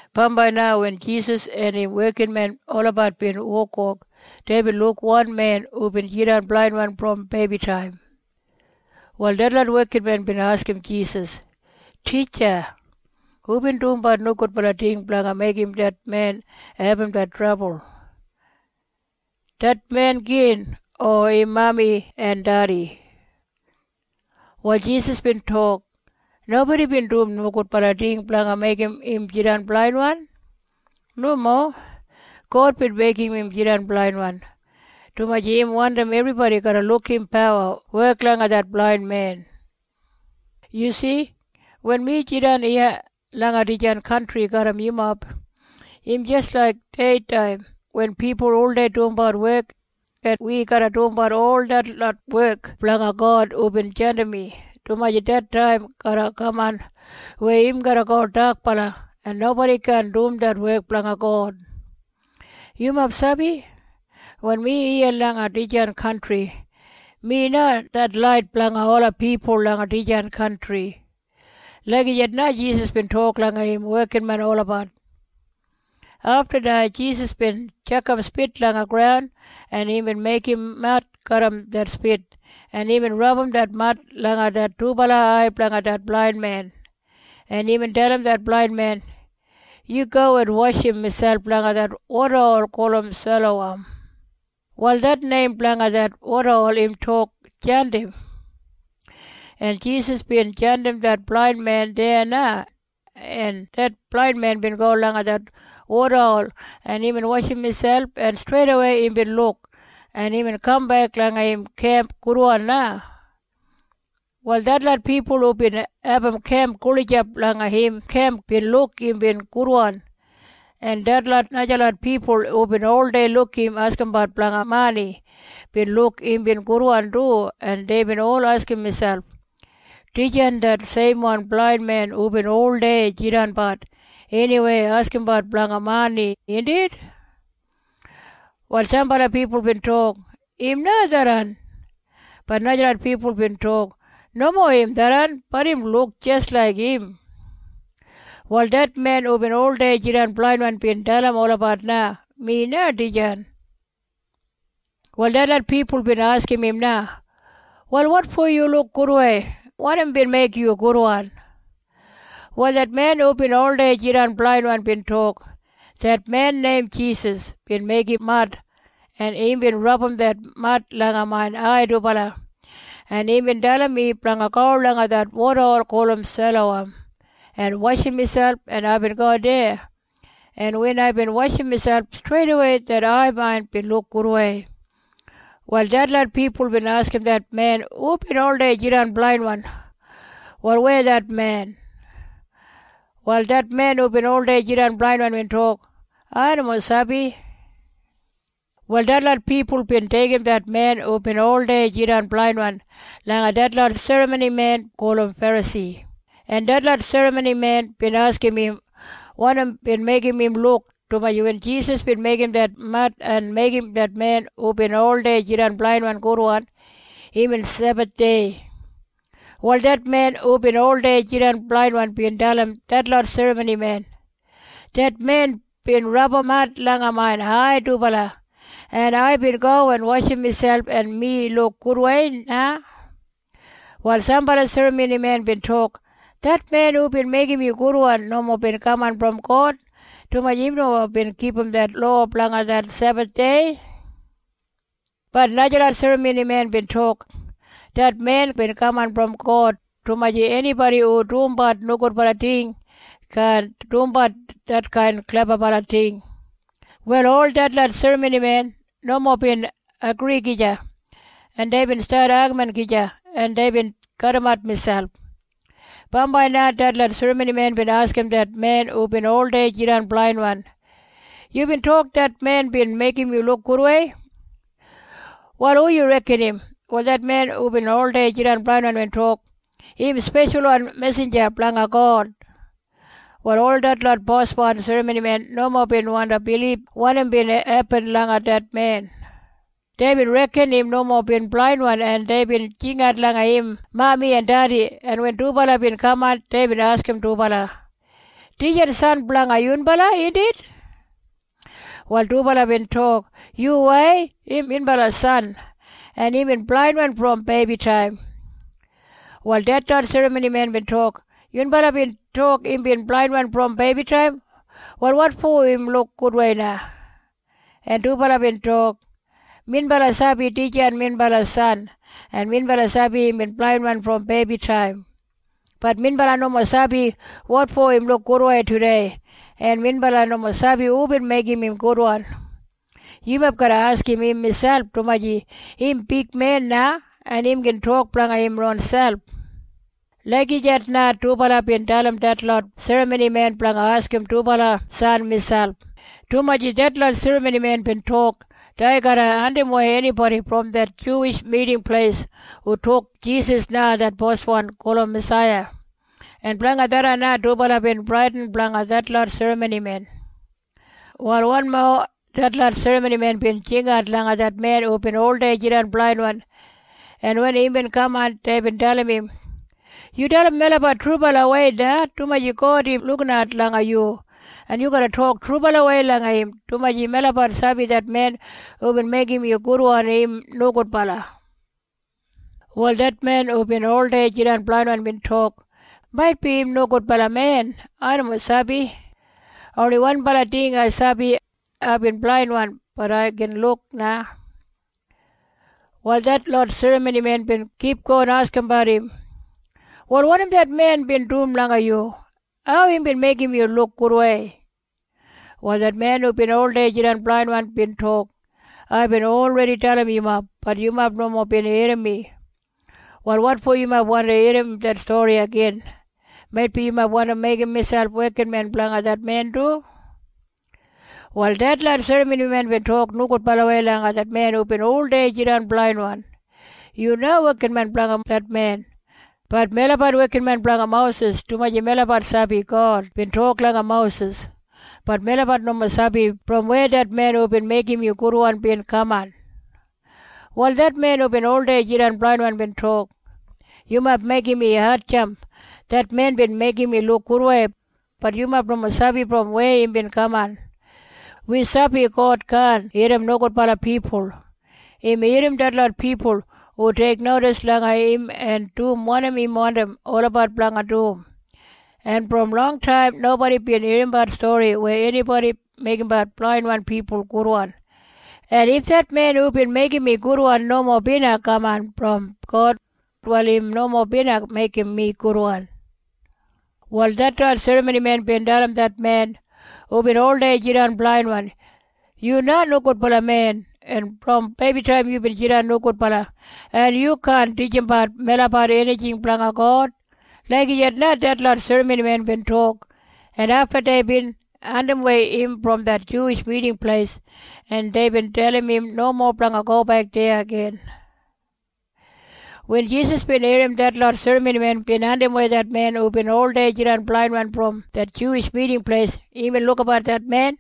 Bambai na wen Jisas en im wekinmen olabat bin wokwok, deibin luk wan men hubin jidan blainwan brom beibitaim. Wal detlot wekinmen bin askim Jisas, “Titja, hubin dumbat nogudbala ting blanga meigim det men abum det trabul? Det men gin o im mami en dedi?” Wal Jisas bin tok, “Nobodi bin dum nogudbala ting blanga meigim im jidan blainwan. Nomo. God bin meigim im jidan blainwan, dumaji im wandim ebribodi garra luk im pawa wek langa det blain men. “Yu si? Wen mi jidan iya langa dijan kantri garram yumob, im jis laik deitaim wen pipul oldei dumbat wek, en wi garra dumbat ol detlot wek blanga God hubin jandim mi, dumaji det taim garra kaman weya im garra go dakbala, en nobodi kaan dum det wek blanga God. “Yumob sabi? Wen mi iya langa dijan wel, mi na det lait blanga ola pipul langa dijan wel.” Lagijat na Jisas bin tok langa im wekinmen olabat. Afta na Jisas bin tjakam spit langa graun, en imbin meigim mad garram det spit, en imbin rabum det mad langa det dubala ai blanga det blain men, en imbin dalim det blain men, “Yu go en washim miselp langa det wodahol gulum Sailowam.” Wal det neim blanga det wodahol im tok Jandim. En Jisas bin jandim det blain men deya na, en det blain men bin go langa det wodahol, en imbin washim miselp, en streidawei imbin luk, en imbin kambek langa im kemp gudwan na. Wal detlot pipul hubin abum kemp gulijap langa im kemp bin luk imbin gudwan, en detlot najalot pipul hubin oldei luk im askimbat blanga mani bin luk imbin gudwan du, en deibin ol askim miselp, “Dijan det seimwan blain men hubin oldei jidanbat eniweya askimbat blanga mani, indit?” Wal sambala pipul bin tok, “Im na tharran.” Bat najalot pipul bin tok, “Nomo im tharran. Bat im luk jis laik im.” Wal det men hubin oldei jidan blainwan bin dalim olabat na, “Mi na dijan.” Wal detlot pipul bin askim im na, “Wal wotfo yu luk gudwei? Wanim bin meigim yu gudwan?” Wal det men hubin oldei jidan blainwan bin tok, “Det men neim Jisas bin meigim mad, en imbin rabum det mad langa main ai dubala, en imbin dalim mi blanga go langa det wodahol gulum Sailowam en washim miselp, en aibin go deya, en wen aibin washim miselp, streidawei det ai main bin luk gudwei.” Wal detlot pipul bin askim det men hubin oldei jidan blainwan, “Wal weya det men?” Wal det men hubin oldei jidan blainwan bin tok, “Ai nomo sabi.” Wal detlot pipul bin deigim det men hubin oldei jidan blainwan langa detlot serramonimen gulum Ferasi, en detlot serramonimen bin askim im wanim bin meigim im luk, dumaji wen Jisas bin meigim det mad en meigim det men hubin oldei jidan blainwan gudwan, imbin Sebathdei. Wal det men hubin oldei jidan blainwan bin dalim detlot serramonimen, “Det men bin rabum mad langa main ai dubala, en aibin go en washim miselp, en mi luk gudwei na.” Wal sambala serramonimen bin tok, “Det men hubin meigim yu gudwan nomo bin kaman brom God, dumaji im nomo bin kipum det lowa blanga det Sebathdei.” Bat najalot serramonimen bin tok, “Det men bin kaman brom God, dumaji enibodi hu dumbat nogudbala ting kaan dumbat detkain klebabala ting.” Wal ol detlot serramonimen nomo bin agri gija, en deibin stat agamin gija, en deibin kadimat miselp. Bambai na detlot serramonimen bin askim det men hubin oldei jidan blainwan, “Yubin tok det men bin meigim yu luk gudwei. Wal hu yu reken im?” Wal det men hubin oldei jidan blainwan bin tok, “Im speshalwan mesinja blanga God.” Wal ol detlot boswan serramonimen nomo bin wandi bilib wanim bin hepin langa det men. Deibin reken im nomo bin blainwan, en deibin jingat langa im mami en dedi, en wen dubala bin kaman, deibin askim dubala, “Dijan san blanga yunbala, indit?” Wal dubala bin tok, “Yuwai. Im minbala san. En imbin blainwan brom beibitaim.” Wal detlot serramonimen bin tok, “Yunbala bin tok imbin blainwan brom beibitaim. Wal wotfo im luk gudwei na?” En dubala bin tok, “Minbala sabi dijan minbala san, en minbala sabi imbin blainwan brom beibitaim. Bat minbala nomo sabi wotfo im luk gudwei tudei. En minbala nomo sabi hubin meigim im gudwan. Yumob garra askim im miselp, dumaji im big men na, en im gin tok blanga im ronselp.” Lagijat na dubala bin dalim detlot serramonimen blanga askim dubala san miselp, dumaji detlot serramonimen bin tok dei garra andimwei enibodi brom det Juwish Miting Pleis hu tok Jisas na det Boswan gulum Masaiya. En blanga tharran na dubala bin bradin blanga detlot serramonimen. Wal wanmo detlot serramonimen bin jingat langa det men hubin oldei jidan blainwan, en wen imbin kaman, deibin dalim im, “Yu dalim melabat trubalawei na, dumaji God im lukinat langa yu, en yu garra tok trubalawei langa im, dumaji melabat sabi det men hubin meigim yu gudwan im nogudbala.” Wal det men hubin oldei jidan blainwan bin tok, “Maitbi im nogudbala men. Ai nomo sabi. Oni wanbala ting ai sabi. Aibin blainwan. Bat ai gin luk na.” Wal detlot serramonimen bin kipgon askimbat im, “Wal wanim det men bin dum langa yu? Hau imbin meigim yu luk gudwei?” Wal det men hubin oldei jidan blainwan bin tok, “Aibin olredi dalim yumob. Bat yumob nomo bin irrim mi. Wal wotfo yumob wandi irrim det stori igin? Maitbi yumob wandi meigim miselp wekinmen blanga det men du?” Wal detlot serramonimen bin tok nogudbalawei langa det men hubin oldei jidan blainwan, “Yu na wekinmen blanga det men. Bat melabat wekinmen blanga Mosis, dumaji melabat sabi God bin tok langa Mosis. Bat melabat nomo sabi brom weya det men hubin meigim yu gudwan bin kaman.” Wal det men hubin oldei jidan blainwan bin tok, “Yumob meigim mi hatjamp. Det men bin meigim mi luk gudwei. Bat yumob nomo sabi brom weya imbin kaman. Wi sabi God kaan irrim nogudbala pipul. Im irrim detlot pipul hu teiknodis langa im en dum wanim im wandim olabat blanga dum. En brom longtaim nobodi bin irrimbat stori weya enibodi meigimbat blainwan pipul gudwan. En if det men hubin meigim mi gudwan nomo bina kaman brom God, wal im nomo bina meigim mi gudwan.” Wal detlot serramonimen bin dalim det men hubin oldei jidan blainwan, “Yu na nogudbala men. En brom beibitaim yubin jidan nogudbala. En yu kaan titjimbat melabat enijing blanga God.” Lagijat na detlot serramonimen bin tok, en afta deibin andimwei im brom det Juwish Miting Pleis, en deibin dalim im nomo blanga gobek deya igin. Wen Jisas bin irrim detlot serramonimen bin andimwei det men hubin oldei jidan blainwan brom det Juwish Miting Pleis, imbin lukabat det men,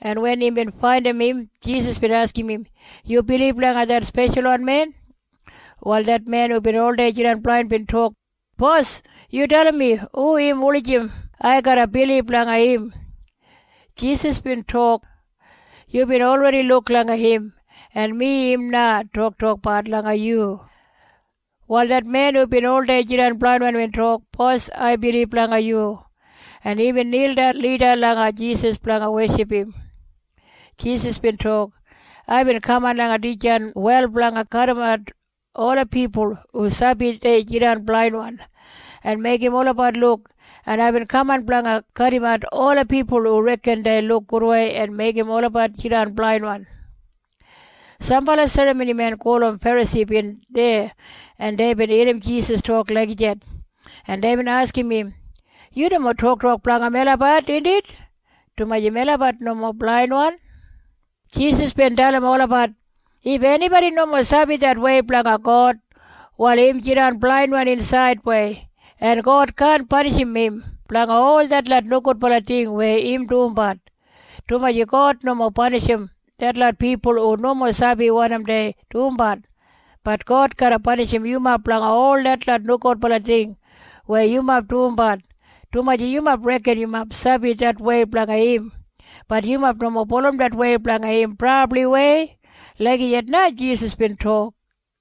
en wen imbin faindim im, Jisas bin askim im, “Yu bilib langa det Speshalwan Men?” Wal det men hubin oldei jidan blainwan bin tok, “Bos, yu dalim mi hu im wulijim ai garra bilib langa im.” Jisas bin tok, “Yubin olredi luk langa im, en mi im na toktokbat langa yu.” Wal det men hubin oldei jidan blainwan bin tok, “Bos, ai bilib langa yu.” En imbin nildan lida langa Jisas blanga weship im. Jisas bin tok, “Aibin kaman langa dijan wel blanga kadimat ola pipul hu sabi dei jidan blainwan en meigim olabat luk, en aibin kaman blanga kadimat ola pipul hu reken dei luk gudwei en meigim olabat jidan blainwan.” Sambala serramonimen gulum Ferasi bin deya, en deibin irrim Jisas tok lagijat, en deibin askim im, “Yu nomo toktok blanga melabat, indit? Dumaji melabat nomo blainwan.” Jisas bin dalim olabat, “If enibodi nomo sabi det wei blanga God, wal im jidan blainwan insaidwei, en God kaan panishim im blanga ol detlot nogudbala ting weya im dumbat, dumaji God nomo panishim detlot pipul hu nomo sabi wanim dei dumbat. Bat God garra panishim yumob blanga ol detlot nogudbala ting weya yumob dumbat, dumaji yumob reken yumob sabi det wei blanga im. Bat yumob nomo bulurrum det wei blanga im brabliwei.” Lagijat na Jisas bin tok.